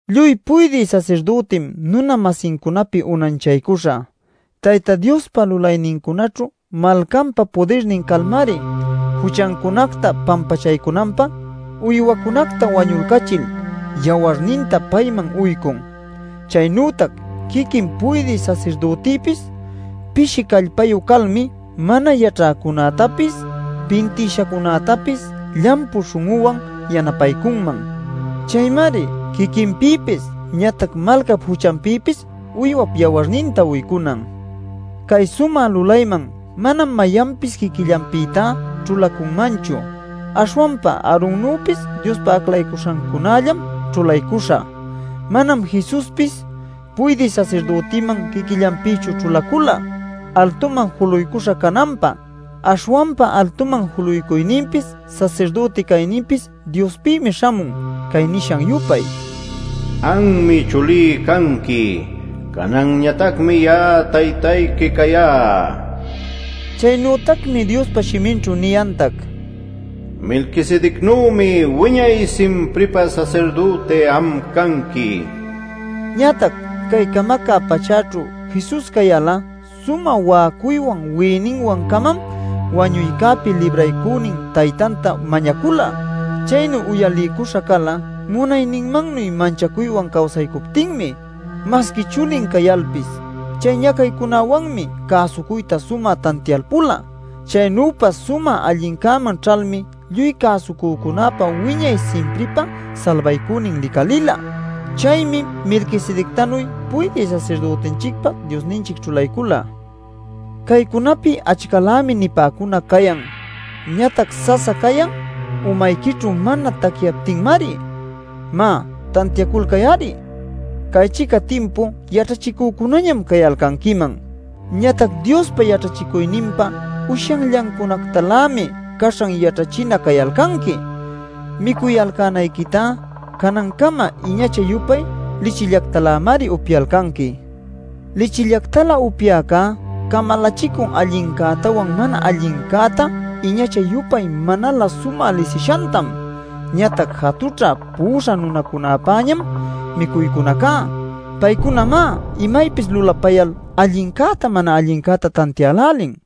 Lluy puydï sasirdütim nuna-masincunapi unanchaycuśha. Tayta Diospa lulaynincunaćhu malcanpa pudirnin calmari juchancunacta pampachaycunanpä uywacunacta wañulcachil yawarninta payman uycun. Chaynütac quiquin puydï sasirdütipis pishi callpayu calmi mana yaćhäcunätapis, pintïshacunätapis llampu śhun'uwan yanapaycunman. Chaymari quiquinpïpis ñatac malcap juchanpïpis uywap yawarninta uycunan. Cay sumä lulayman manam mayanpis quiquillanpïtá ćhulacunmanchu. Aśhwanpa Aaronnüpis Diospa aclaycuśhancunällam ćhulaycuśha. Manam Jesuspis puydï sasirdütiman quiquillanpïchu ćhulacula altuman juluycuśha cananpä. Aśhwanpa altuman juluycuyninpis sasirdüti cayninpis Diospïmi śhamun cay nishan-yupay: “Anmi Chulí canqui; cananñatacmi ya'a Taytayqui cayá” nil. Chaynütacmi Diospa shiminćhu niyantac: “Melquisedecnümi wiñay-simpripä sasirdüti am canqui” nil. Ñatac cay camacä pachäćhu Jesus cayal sumä wa'acuywan wi'iyninwancamam wañuycäpi Libraycünin Taytanta mañacula. Chaynu uyaliycuśha cala munayninmannuy manchacuywan cawsaycuptinmi. Masqui chulin cayalpis, chay ñacaycunäwanmi cäsucuyta sumä tantialpula. Chaynüpa sumä allincäman ćhalmi lluy cäsucücunäpa wiñay simpripä salbaycünin licalïla. Chaymi Melquisedectanuy puydï sasirdütinchicpa Diosninchic ćhulaycula. Caycunapi achcalämi nipäcunac cayan. Ñatac sasa cayan umayquićhu mana tacyaptinmari. ¡Má, tantiaculcay-ari! Cay-chica timpu yaćhachicücunañam cayalcanquiman. Ñatac Diospa yaćhachicuyninpa ushyanllancunactalämi caśhan yaćhachina cayalcanqui. Micuyalcänayquitá canancama iñacha-yupay lichillactalämari upyalcanqui. Lichillactalä upyäcá camalachicun allincätawan mana allincäta iñacha-yupay manalä sumä lisishantam. Ñatac jatućhä pu'uśha nunacunäpäñam micuycunacá; paycunamá imaypis lulapayal allincäta mana allincäta tantiälälin.